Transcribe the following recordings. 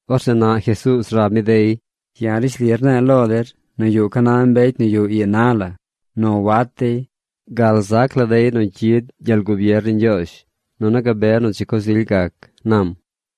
Orzeꞌ naꞌ Jesuuz rab mi dey: ―Ya̱ rishli rne̱e̱ lo der nu yuꞌ ca na mbecy nu yuꞌ ii na la nu wat dey gal zac la dey nu cyid gyel gubier ni Ñgyoozh, nunu gabe nu dzi coz ily gac ―nam.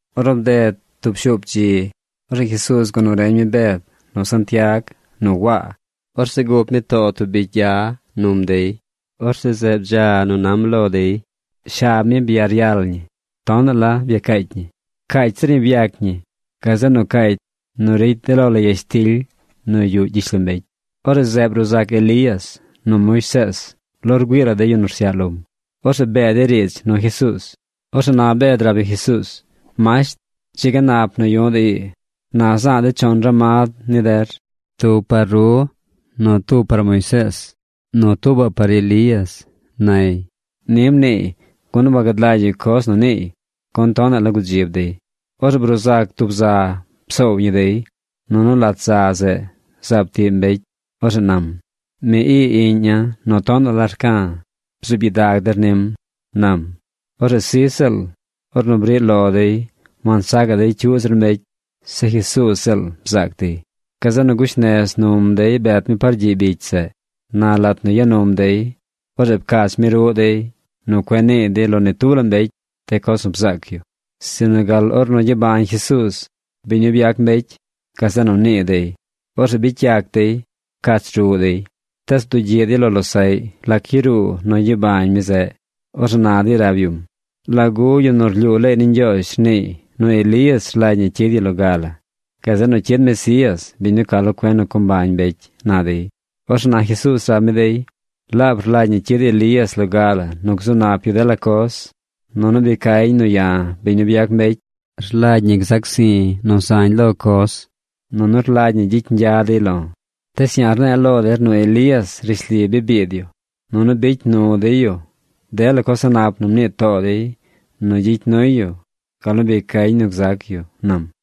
Ornu bded tub shuup dzi, orzeꞌ Jesuuz gua nu reñ mi Bed, nu Santiag, nu Waa. Orzeꞌ gup mi too tub bicy gya num dey. Orzeꞌ zeꞌ bdza nu nam lo dey. Shab mi byaryal ñi. Tonaꞌ la byacaacy ñi. Caacy zir ñi byac ñi gazeꞌ nu caacy nu ricy de lo la yashtily nu yuꞌ gyishlombecy. Orzeꞌ zeꞌ bruu zac Elías nu Moisees lo rgüii la de yu nu rsyaꞌ lom. Orzeꞌ bee dey riidz nu Jesuuz. Orzeꞌ na Bed rab yu Jesuuz: ―Masht, ¡dzi ga nap nu yu̱ꞌ de̱ ii! Na za̱a̱ de̱ chon ramad ni der: tub par ru nu tuubaꞌ par Moisees nu tuubaꞌ par Elías ―nay. Ni mniiy, gun wagad lagy yu coz nu niiy, gun tonaꞌ la gudzib dey. Orzeꞌ bruu zac tub za psoow ñi dey. Nunu lat za zeꞌ zaab tiꞌ mbecy. Orzeꞌ nam: ―Mi ii iꞌña̱ nu tonaꞌ la rca̱. Bzuub gyidag der nim ―nam. Orzeꞌ sij ziꞌl ornu briꞌ lo dey wansacaꞌ dey cyuꞌ zir mbecy. Zeꞌ Jesuuz ziꞌl bzaac dey. Gazeꞌ nu gush nez num dey bet mi par gyiꞌ bicy zeꞌ. Na lat nu ya num dey, orzeꞌ pcach mi ruꞌ dey nu cueꞌ nii dey lo ni tub la mbecy de coz nu bzaac yu. Sinu gal ornu gyabañ Jesuuz, biñ nu byac mbecy, gazeꞌ nu nii dey. Orzeꞌ bicy yac dey pcach ruꞌ dey. Tees bdugyiꞌ dey lo losaꞌy lac yaruu nu gyabañ mi zeꞌ. Orzeꞌ na dey rab yum: ―¿Lagu de yu nu rlyuu leey ni Ñgyoozh rniiy nu Elías rlagy ñi cyid yu loga la? Gazeꞌ nu cyid Mesías, biñ nu ca lo cuen nu co mbañ mbecy ―na dey. Orzeꞌ na Jesuuz rab mi dey: ―Laab rlagy ñi cyid Elías loga nu gzu nap yu dela coz. Nunu bi cañ nu ya̱, biñ nu byac mbecy, rlagy ñi gzac zi̱ nu zañ lo coz, nunu rlagy ñi gyicy ñgya dey lo̱. Tees ya̱ rne̱e̱ lo der nu Elías rishli bi biid yu nunu bicy nu dey yu dela coz a̱ꞌ nap nu mnii too dey nu gyicy nuy yu gal nu bi cañ nu gzac yu ―nam.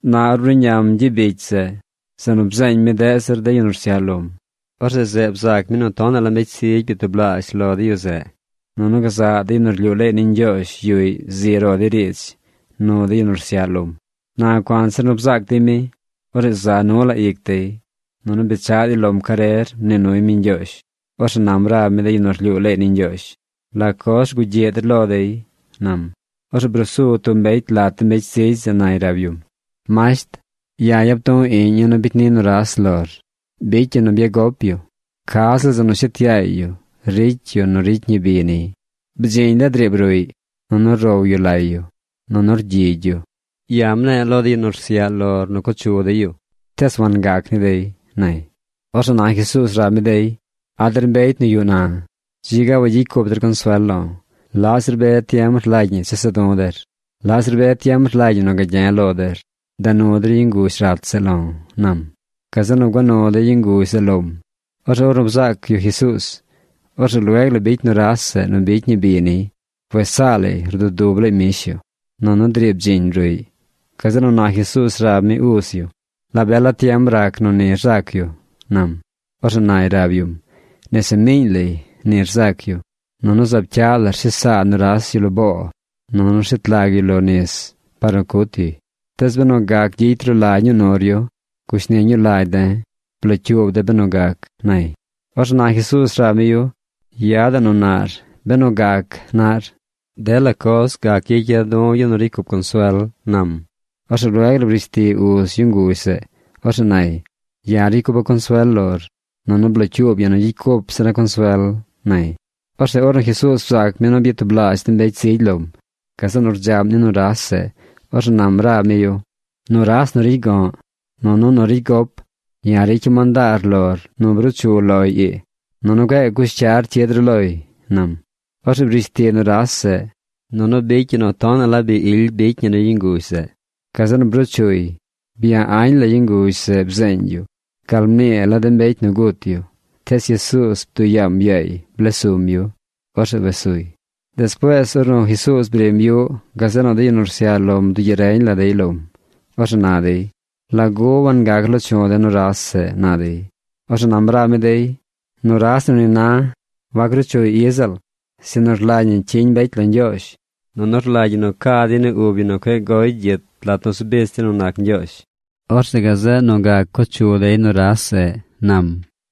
Na ornu bruꞌñam gyiꞌ bicy zeꞌ, zeꞌ nu byeeñ deꞌ zir de yu nu rsyaꞌ lom, orzeꞌ zeꞌ bzaac mi nu tonaꞌ la mbecy zigy byatublaazh lo de yu zeꞌ. Nunu gazaꞌ de yu nu rlyuu leey ni Ñgyoozh yuꞌy zi ro dey riidz nu de yu nu rsyaꞌ lom. Na cuanzir nu bzaac dey mi, orzeꞌ za nu la ic dey, nunu bechaꞌ dey lom carer mnii nuy mi ñgyoozh. Orzeꞌ nam rab mi de yu nu rlyuu leey ni Ñgyoozh: ―¿La coz rgugyiꞌ der lo dey? ―nam. Orzeꞌ brusu tub mbecy lat de mbecy zigy zeꞌ nay rab yum: ―Masht, ya̱ yap du̱ iꞌña̱ nu bicy ni nuras lor. Bicy yu nu byagop yu. Ca ziꞌl nu shet yaay yu ricy yu nu ricy ñi bi niy. Bdziñ la driib ruꞌy, nunu row yu lay yu, nunu rgyigy yu. Ya̱ mne̱e̱ lo de yu nu rsyaꞌ lor nu co chu dey yu, tees wangac ni dey ―nay. Orzeꞌ na Jesuuz rab mi dey: ―¡A̱ der mbecy nu yuꞌ na! Dzi ga wagyicy cup der consuel lo̱. ¿Laꞌ zir be tiem rlagy ñi chesa̱ du̱ der? ¿Laꞌ zir be tiem rlagy ñi nu gagye̱ lo der? Da nu der yu nguzh rat zeꞌ lo̱ ―nam. Gazeꞌ nu gua nu dey yu nguzh zeꞌ lom. Orzeꞌ ornu bzaac yu Jesuuz, orzeꞌ lueg la bicy nuras zeꞌ nu bicy ñi bi niy. Wes saa lay rdudub lay mbish yu. Nunu driib bdziñ ruꞌy. Gazeꞌ nu na Jesuuz rab mi uz yu: ―¿La be la tiem rac nu ni rzac yu? ―nam. Orzeꞌ nay rab yum: ―Nese miiñ lay ni rzac yu. Nunu zaab cyaꞌ la rshes saa nuras yu lo boo nunu rshet lag yuy lo nis par nu cut yuy. Tees benu gac gyicy ru la ñuu nur yu, gushni ñuu lagy de̱. Blocyuub de̱ benu gac ―nay. Orzeꞌ na Jesuuz rab mi yu: ―Yadaꞌ nu naꞌr: “Benu gac”, naꞌr. Dela coz gac gyicya̱ du̱ yu nu ricy cup consuel ―nam. Orzeꞌ lueg la brish ti uz yu nguzh zeꞌ. Orzeꞌ nay: ―Ya̱ ricy cupa̱ consuel lor. Nunu blocyuub ya̱ nu gyicy cup zira̱ consuel ―nay. Orzeꞌ ornu Jesuuz bzaac mi nu byatublaazh de mbecy zigy lom, gazeꞌ nu rdzaꞌm ni nuras zeꞌ. Orzeꞌ nam rab mi yu: ―Nuras nu ricy go̱ꞌ nunu nu ricy gop, ya̱ ricya̱ mandaar lor nu bruu chu loy ii. Nunu cueꞌ gaꞌ cush cyar cyid ru loy ―nam. Orzeꞌ brish ti nuras zeꞌ, nunu bicy yu nu tonaꞌ la bi ily bicy ñi ni yu nguzh zeꞌ. Gazeꞌ nu bruu chuy. Bya añ la yu nguzh zeꞌ bzeeñ yu gal mnii la de mbecy nu gut yu. Tees Jesuuz bduꞌ yaam yaay bles sum yu. Orzeꞌ wes suy. Despuees ornu Jesuuz brim yuꞌ, gazeꞌ nu de yu nu rsyaꞌ lom bdugyiꞌ reñ la dey lom. Orzeꞌ na dey: ―¿Lagu wangac loo chu̱ de nuras zeꞌ? ―na dey. Orzeꞌ nam rab mi dey: ―Nuras nu ni na wac ruu chuy i ziꞌl, sinu rlagy ñi cyiñ mbecy lo Ñgyoozh nunu rlagy ñi nu ca dey ni ub yu nu cueꞌ goy gyit lat nu zu bich dey nu nac Ñgyoozh. Orzeꞌ gazeꞌ nu gac co chu dey nuras zeꞌ ―nam.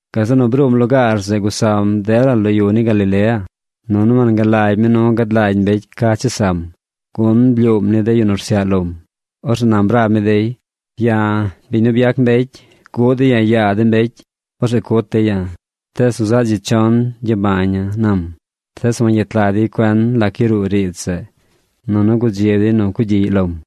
Gazeꞌ nu bruum lugaar zeꞌ gusam dela lo yu ni Galilea, nunu wangalagy mi nu gad lagy mbecy ca chesam, gun blyuum ni de yu nu rsyaꞌ lom. Orzeꞌ nam rab mi dey: ―Ya̱, biñ nu byac mbecy, guꞌ dey ya̱ yaa de mbecy. Orzeꞌ cut dey ya̱. Tees nu zaꞌ dzi chon gyabaña̱ ―nam. Tees wangyet lag dey cuen lac yaruu riidz zeꞌ. Nunu gudzib dey nu cugyiꞌy lom.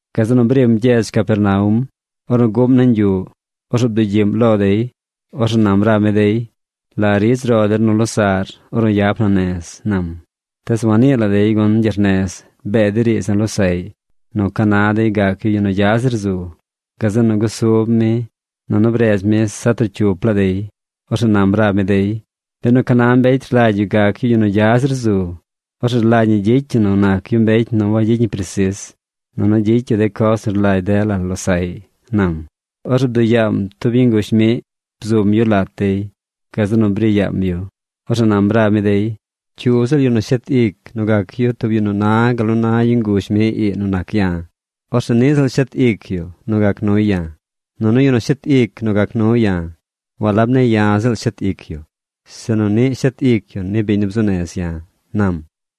Gazeꞌ nu brim gyedz Capernaum. Ornu guꞌm nañ yuꞌ, orzeꞌ bdugyiꞌm lo dey. Orzeꞌ nam rab mi dey: ―¿La ridz ro der nu losaꞌr ornu yap na nez? ―nam. Tees wannii la dey gun gyernez bee dey riidz nu losaꞌy nu ca na dey gac yu yu nu gya zir zu. Gazeꞌ nu gusub mi nunu bredz mi zaꞌ trocyup laa dey. Orzeꞌ nam rab mi dey: ―Benu ca na mbecy rlagy yu gac yu yu nu gya zir zu, orzeꞌ rlagy ñi gyicy yu nu nac yu mbecy nu wagyicy ñi presis nunu gyicy yu de coz nu rlagy dela losaꞌy ―nam. Orzeꞌ bduꞌ yaam tub yu nguzh miꞌ. Bzum yu lat dey. Gazeꞌ nu bri yaam yu. Orzeꞌ nam rab mi dey: ―Cyu ziꞌl yu nu shet ic nu gac yu tub yu nu na gal na yu nguzh miꞌ ii nu nac ya̱, orzeꞌ niꞌ ziꞌl shet ic yu nu gac nuy ya̱. Nunu yu nu shet ic nu gac nu ya̱, walab ne̱ ya̱ ziꞌl shet ic yu, sinu niꞌ shet ic yu ni biñ nu bzuu nez ya̱ ―nam.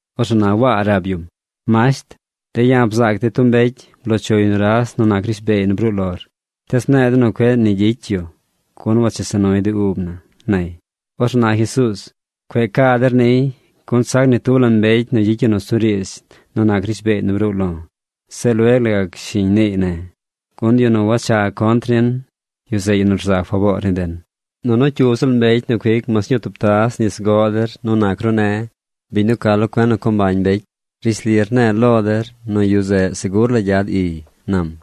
Orzeꞌ na Waa rab yum: ―Masht, de̱ ya̱ bzaac de̱ tub mbecy bloo chuy nuras nu nac rishbeey nu bruu lor, tees mne̱e̱ de̱ nu cueꞌ nu ni gyicy yu gun wachesa nuy de ub na ―nay. Orzeꞌ na Jesuuz: ―Cue ca der niy, gun sac ni tub la mbecy nu gyicy nusuriidz nu nac rishbeey nu bruu lo̱, se lueg la gac shiñ niiy ne̱. Gun yu nu wacha contr nin, yu zeꞌ yu nu rza faboor ni den. Nunu cyu ziꞌl mbecy nu cuic mas ñuu tub taz nis goꞌ der nu nac ru ne̱, biñ nu ca lo cuen nu co mbañ mbecy, rishli rne̱e̱ lo der nu yu zeꞌ segur la gyad iy ―nam―.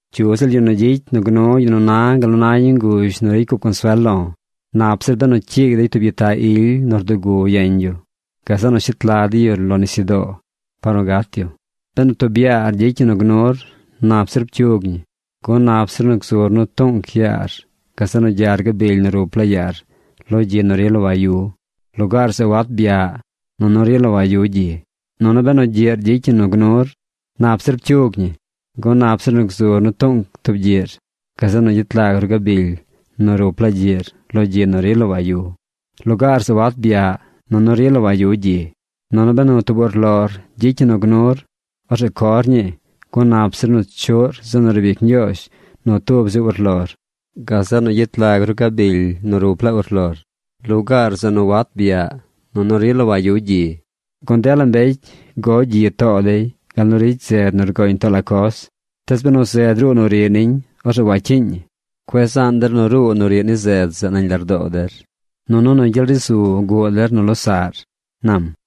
’Cyu ziꞌl yu nu gyicy nu gnu yu nu na gal na tub yu nguzh nu ricy cup consuel lo̱, nap zir benu cyiigy dey tub gyitaꞌ ily nu rdugu yeñ yu. Gazeꞌ nu shet lag dey yu lo nisyudoo par nu gat yu. Benu tub yaar gyicy ñi nu gnur, nap zir pcyug ñi, gun nap zir nu gzur nu tuꞌnc yaar gazeꞌ nu gyar gabily nu rup laa yaar lo gyi nu rila wayu. Lugaar zeꞌ wat byaꞌ nunu rila wayu gyi. Nunu benu gyiꞌr gyicy ñi nu gnur, nap zir pcyug ñi, gun nap zir nu gzur nu tuꞌnc tub gyiꞌr, gazeꞌ nu gyet lag ru gabily nu rup laa gyiꞌr lo gyi nu rila wayu. Lugaar zeꞌ wat byaꞌ nunu rila wayu gyi. Nunu benu tub urlor gyicy ñi nu gnur, orzeꞌ cor ñii, gun nap zir nu chuꞌr zeꞌ nu riib ic Ñgyoozh nu tub zi urlor, gazeꞌ nu gyet lag ru gabily nu rup laa urlor. Lugaar zeꞌ nu wat byaꞌ nunu rila wayu gyi. ’Gun dela mbecy go gyi too dey gal nu ricy zed nu rgoñ too la coz. Tees benu zed ruu nu riꞌ niñ, orzeꞌ wacyiiñ ñi. Cueꞌ zaan der nu ruu nu riꞌ ni zed zeꞌ nañ lardoo der. Nunu nu gyel ri zu guꞌ der nu losaꞌr ―nam.